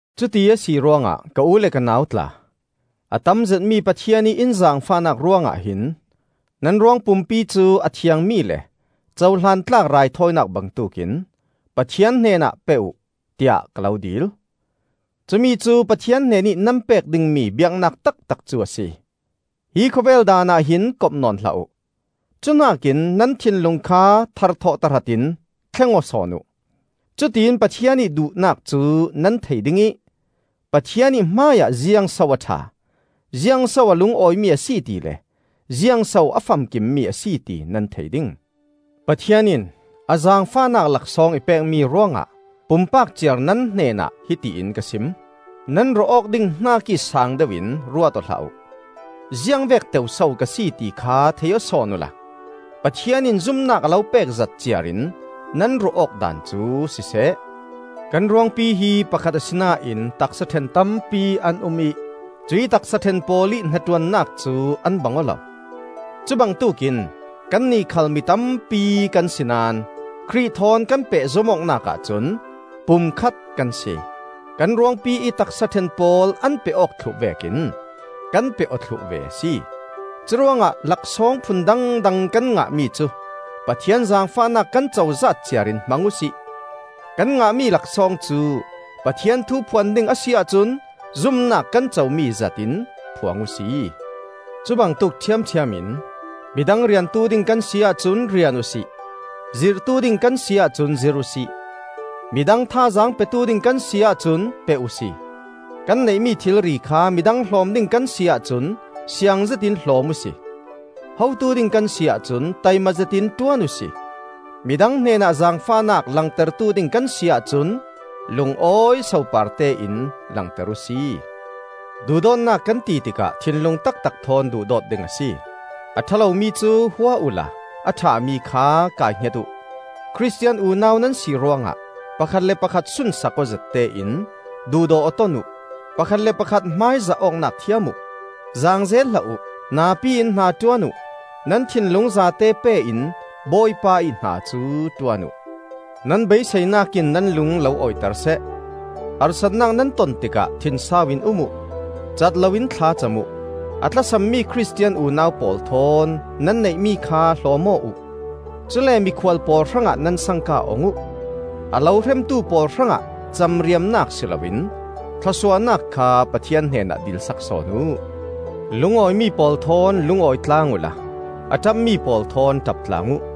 Cuti a si ruangah ka u le ka nau tla, a tam zetmi Pathian ih in zaangfahnak ruangah hin nan ruangpumpi cu a thiangmi le cohlan tlak raithawinak bangtuk in Pathian hnenah pe uh, tiah ka lo dil. Cumi cu Pathian hnenih nan pek dingmi biaknak taktak cu a si. Hi khawvel daanah hin kop nawn hlah uh; cuhnak in nan thinlung kha tharthawh tahratin thleng aw sawn uh. Cutiin Pathian ih duhnak cu nan thei ding ih Pathian ih hmaiah ziangso a ṭha, ziangso a lungawi mi a si tile ziangso a famkimmi a si ti nan thei ding. Pathian in a zaangfahnak laksawng i pekmi ruangah pumpak ciar nan hnenah hiti in ka sim: Nan ruah awk ding hnakih saang deuh in ruat aw hlah uh. Ziangvek teu so ka si ti kha thei aw sawn uhla Pathian in zumnak a lo pekzat ciar in nan ruah awk daan cu siseh. Kan ruangpi hi pakhat asinain taksa ṭhen tampi an um ih cuih taksa ṭhen pawl ih hnaṭuannak cu an bang aw lo. Cu bangtuk in kannih khal mi tampi kan si naón Khrih thawn kan pehzom awknak ahcun pum khat kan si. Kan ruangpi ih taksa ṭhen pawl an peh awk thluh vekin kan peh aw thluh ve a si. Curuangah laksawng phun dangdang kan ngahmi cu Pathian zaangfahnak kan cozat ciarin hmang uhsi. Kan ngahmi laksawng cu Pathian thu phuan ding a si ahcun zumnak kan comi zat in phuang uhsi; cubangtuk ṭhiamṭhiam in midang riantu ding kan si ahcun rian uhsi; zirhtu ding kan si ahcun zirh uhsi; midang thazaang petu ding kan si ahcun pe uhsi. Kan neihmi thilri kha midang hlawm ding kan si ahcun siang zetin hlawm uhsi. Hotu ding kan si ahcun taimazet in ṭuan uhsi; midang hnenah zaangfahnak langtertu ding kan si ahcun lungawi soparte in langter uhsi. Duhdawtnak kan ti tikah thinlung taktak thawn duhdawt ding a si. A ṭha lomi cu hua uhla a ṭhami kha kai hnget uh. Khristian unau nan si ruangah pakhat le pakhat sunsak awzet tein duhdaw aw ton uh. Pakhat le pakhat hmaizah awknak thiam uh. Zaangzel hlah uh; napi in hnaṭuan uh. Nan thinlung zate pe in Bawipa ih hna cu ṭuan uh. Nan beiseinak in nan lung lo awiter seh; harsatnak nan ton tikah thinsau in um uh; cat loin thlacam uh. A tlasam mi Khristian unau pawl thawn nan neihmi kha hlawm aw uh. Cule mikhual pawl hrangah nan sangka ong uh. A lo hremtu pawl hrangah camriamnak si loin thlawsuahnak kha Pathian hnenah dilsak sawn uh. Lungawimi pawl thawn lungawi tlang uhla a ṭapmi pawl thawn ṭap tlang uh.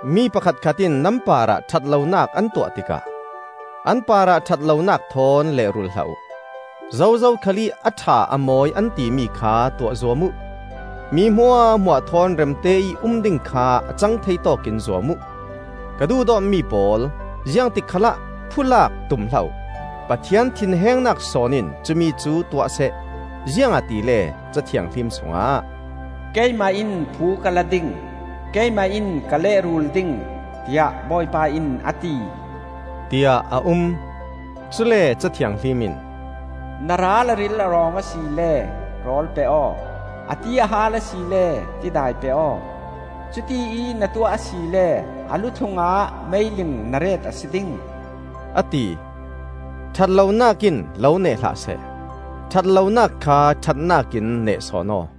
Mi pakhatkhat in nan parah ṭhat lonak an tuah tikah an parah ṭhat lonak thawn leh-rul hlah uh. Zozo khalih a ṭha a mawi an timi kha tuah zuam uh. Mi hmuahhmuah thawn remte ih um ding kha a cangthei tawkin zuam uh. Ka duhdawtmi pawl, ziangtik khalah phulak tum hlah uh; Pathian thinhengnak sawn in cumi cu tuahseh. Ziangahtile Ca Thianghlim sungah, “Keimah in phu ka la ding; Keimah in ka leh-rul ding, tiah Bawipa in a ti,” tiah a um. Cule Ca Thianghlim in, “Na ral a ril a rawng asile rawl pe aw; a ti a haal asile tidai pe aw; cutiih na tuah asile a lu-thlungah meiling na ret a si ding,” a ti. Ṭhat lonak in lo neh hlah seh; ṭhat lonak kha ṭhatnak in neh sawn aw.